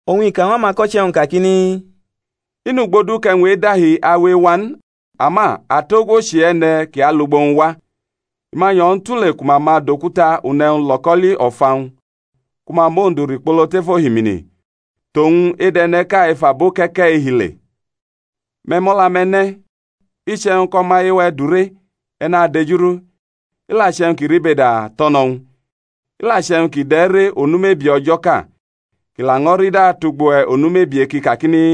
Oñ i ka ñw amako̩che̩-wñ kakini, I nʼugbo du kʼe̩wñ e̩dahi awe ewa n; ama atogwo chʼe-e̩ne̩ kʼi alʼugbo-wñ wa! I ma nyo̩ ñw u tule ku ma ma dʼokuta une̩wñ lo̩ko̩li o̩fa-wñ, ku ma mʼowñ du rikpolo tef ohimini, tʼowñ edʼe̩ne̩ʼka ef abo ke̩ke̩-i hi le. Me̩ mʼo̩la-me̩ ne̩: iche̩wñ kʼo̩maye-we̩ dure, e̩ nadejurʼu; i la che̩wñ kʼi ribeda tʼo̩ no ñw u. I la che̩wñ kʼi dʼe̩ re onu mebie o̩jo̩ʼka, kʼi laño̩ rida tʼugbo-we̩ onu mebie kʼi kakini,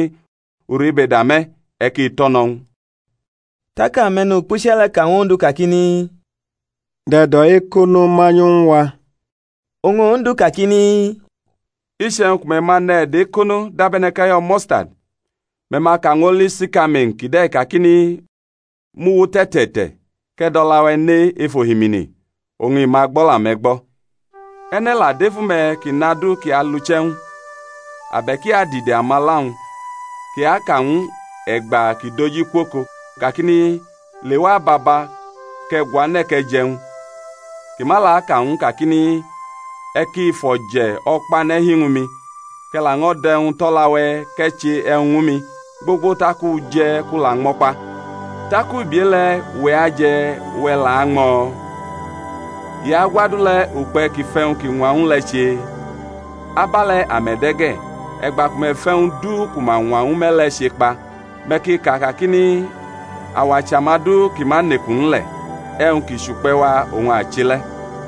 U ribeda me̩, e̩ ki to̩no̩ ñw u. Tak ame̩nukpuche̩ le̩ ka ñw Ondu kakini, Dʼe̩do̩-ekono manyu ñw a. Oñ Ondu kakini, Iche̩wñ ku me̩ ma ne̩ e̩do̩-ekono dabe̩ne̩ kʼe̩yo̩ mustadi, me̩ ma ka ñw oli sikamain kide̩ kakini, Muwu tʼe̩te̩te̩te̩, kʼe̩ dʼo̩la-we̩ ne ef ohimini; oñ i ma gbo̩la-me̩ gbo̩. E̩ne̩ la dʼefu-me̩ kʼi nʼadu ki alʼuche̩-wñ, abe̩k i adide amala-wñ, kʼi aka ñw u e̩gba kʼi doji kwʼoko, kakini, Lewa ababa, kʼe̩ guane̩ kʼe̩ jʼe̩wñ; kʼi ma la aka ñw u n kakini, E̩ ki fʼo̩je̩ o̩kpane̩ hi ñwu mi, kʼe̩ laño̩ dʼe̩wñ tʼo̩la-we̩ kʼe̩ che e̩wñ ñwu mi, gbogbo tak u je̩ kʼu la ñmo̩ kpa; tak ubi e-le̩ uwe̩ aje̩ uwe̩ la añmo̩? I agwʼadu le̩ ukpe̩ kʼi fʼe̩wñ kʼi ñwa ñw u le̩ che? Abe̩le̩ ame̩ de̩ ge̩, e̩gba ku me̩ fʼe̩wñ du ku ma ñwa ñwu me̩ le̩ chekpa, me̩ ki ka kakini, Awa chʼamadu ki ma nʼeku n le̩; e̩wñ ki chʼukpe̩-wa oñ a che le̩.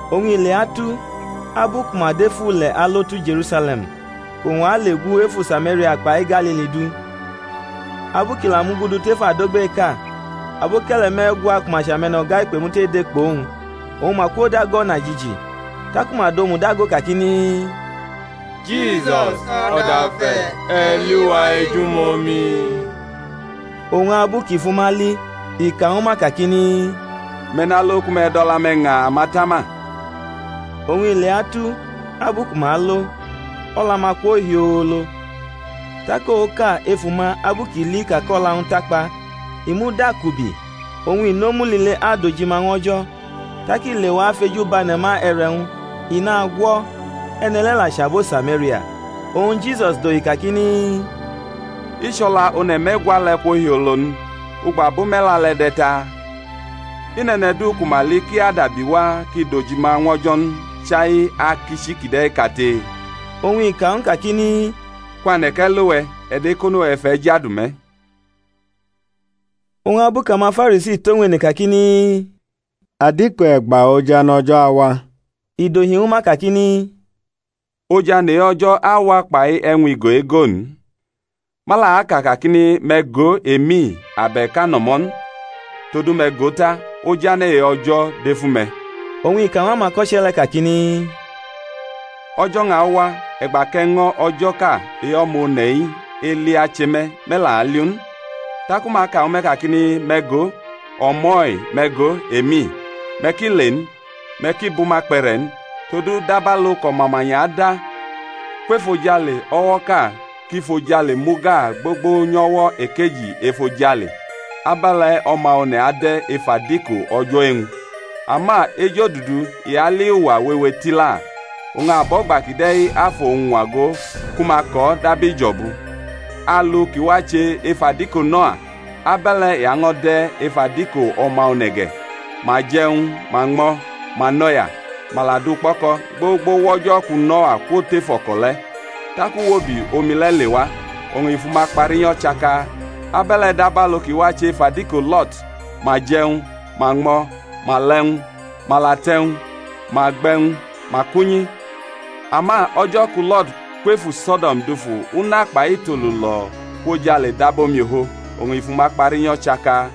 Oñ i leatu, abu ku ma dʼef ule̩ alo tu Je̩rusale̩m kʼowñ ale gu efu Samaria kpai Galili du, abu kʼi la mugudu tef adogbeʼka, aboke̩le̩ me̩gwa ku ma chʼame̩no̩ga-ikpemute de kpʼowñ, oñ ma kwodago o̩najiji: taku ma dʼomu dago kakini, Jisus, O̩dafe̩, e̩ li wa ejumomi. Oñ abu kʼi fʼuma li i ka ñwu ma kakini, Me̩ nalo ku me̩ dʼo̩la-me̩ ña amatama. Oñ i leatu, abu ku ma alo, o̩la-ma kwo hiolo. Tak oka efʼuma abu kʼi li ka kʼo̩la-wñ takpa, i mudakubi, oñ i nʼomu lile adojima ñw O̩jo̩. Tak i lewa fʼeju bʼane̩ ma e̩re̩-wñ, i nagwʼo̩; e̩ne̩ le̩ la chʼabo Samaria. Oñ Jisus dohi kakini, I chʼo̩la one̩ me̩gwa le̩ kwo hiolo n? Ugbo abo me̩la le̩ de̩ taa? I nʼe̩ne̩ du ku ma li kʼi adabiwa kʼi dʼojima ñw O̩jo̩ n, chai akichi kide̩ kate? Oñ i ka ñw u kakini, Kwane̩, kʼe̩ lo we̩: e̩do̩ ekono-we̩ fʼe̩ jadu me̩. E̩gba oñ ojane̩ O̩jo̩ awa? Oñ abu kʼamaFarisi tʼowñ ene kakini, Adiko e̩gba ojane̩ O̩jo̩ awa? I dohi ñwu ma kakini, Ojane̩ e-O̩jo̩ awa kpai e̩wñ-igo-ego n; ma la aka kakini, Me̩ go, emi, abe̩k, ano̩mo̩ n! todu me̩ go ta, ojane̩ e-O̩jo̩ dʼefu-ume̩. Oñ i ka ñw amako̩che̩ le̩ kakini, O̩jo̩-wñ awa, e̩gba kʼe̩ño̩ o̩jo̩ʼka e-O̩ma One̩-i eli ache me, me̩ la aliʼu n. Taku ma aka ñwu me̩ kakini, Me̩ go, o̩mo̩-i! me̩ go, emi! Me̩ ki le n, me̩ ki bʼuma kpe̩re̩ n. Todu dabalu kʼo̩mamanya ada kwef ojale o̩wo̩ʼka kʼi fʼojale mu gaa gbogbo nyʼo̩wo̩ ekeji efojale, abe̩le̩ O̩ma One̩ ade̩ ef adiko o̩jo̩ e-wñ. Ama ejodudu i ali uwa wewe tila, oñ abo̩gba kide̩ afʼowñ ñwago ku ma kʼo̩ dab ijo̩bu. Alu kʼi wache ef adiko Noa, abe̩le̩ i año̩ de̩ ef adiko O̩ma One̩ ge̩. Ma je̩ e̩wñ, ma ñmo̩, ma nʼo̩ya, ma la du kpo̩ko̩, gbogbo wʼo̩jo̩ ku Noa kwo̩tʼef o̩ko̩ le̩, tak uwobi omi le̩ lewa, oñ i fʼuma kpa rinyo̩ chaka. Abe̩le̩ dabalu ki wache ef adiko Lo̩t; ma je̩ e̩wñ, ma ñmo̩, ma la e̩wñ, ma la tʼe̩wñ, ma gbe̩ e̩wñ, ma kʼunyi; ama o̩jo̩ ku Lo̩t kwʼefu So̩do̩m dufu una kpai itolu lo̩ kwʼojale dab omiofo, oñ i fʼuma kpa rinyo̩ chaka: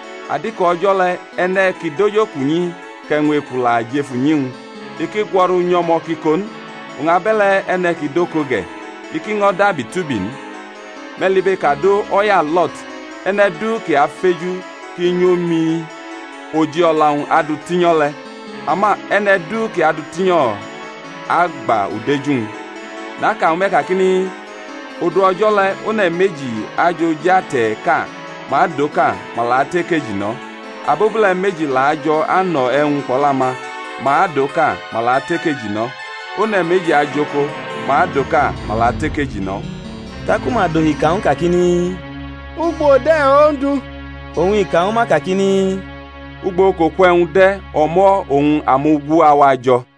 Adiko o̩jo̩ le̩ e̩ne̩ kʼi dʼojokunyi kʼe̩wñ-eku-wñ la jʼef unyi, i ki gwo̩ru nyʼo̩mo̩ kʼi ko n: oñ abe̩le̩ e̩ne̩ kʼi dʼoko ge̩, i ki ño̩ dabi tʼubi n. Me̩ libekado o̩ya Lo̩t. E̩ne̩ du kʼi afeju kʼi nyomi oji o̩la-wñ adutinyo̩ le̩; ama e̩ne̩ du kʼi adʼu rinyo̩, agba udeju-wñ. Naka ñwu me̩ kakini, Odu o̩jo̩ le̩ one̩ meji ajʼoj ate̩ʼka; ma adʼoka, ma la atʼekeji no̩. Abobule̩ meji la ajo̩ ano̩ e̩wñ kpʼo̩la-ma; ma adʼoka, ma la atʼekeji no̩. [ One̩ meji ajʼoko; ma adʼoka, ma la atʼekeji no̩.] Taku ma dohi ka ñw u kakini, Ugbo de̩ Ondu? Oñ i ka ñwu ma kakini, Ugbo kʼoku e̩wñ de̩, o̩mo̩ oñ amugu awa jo̩.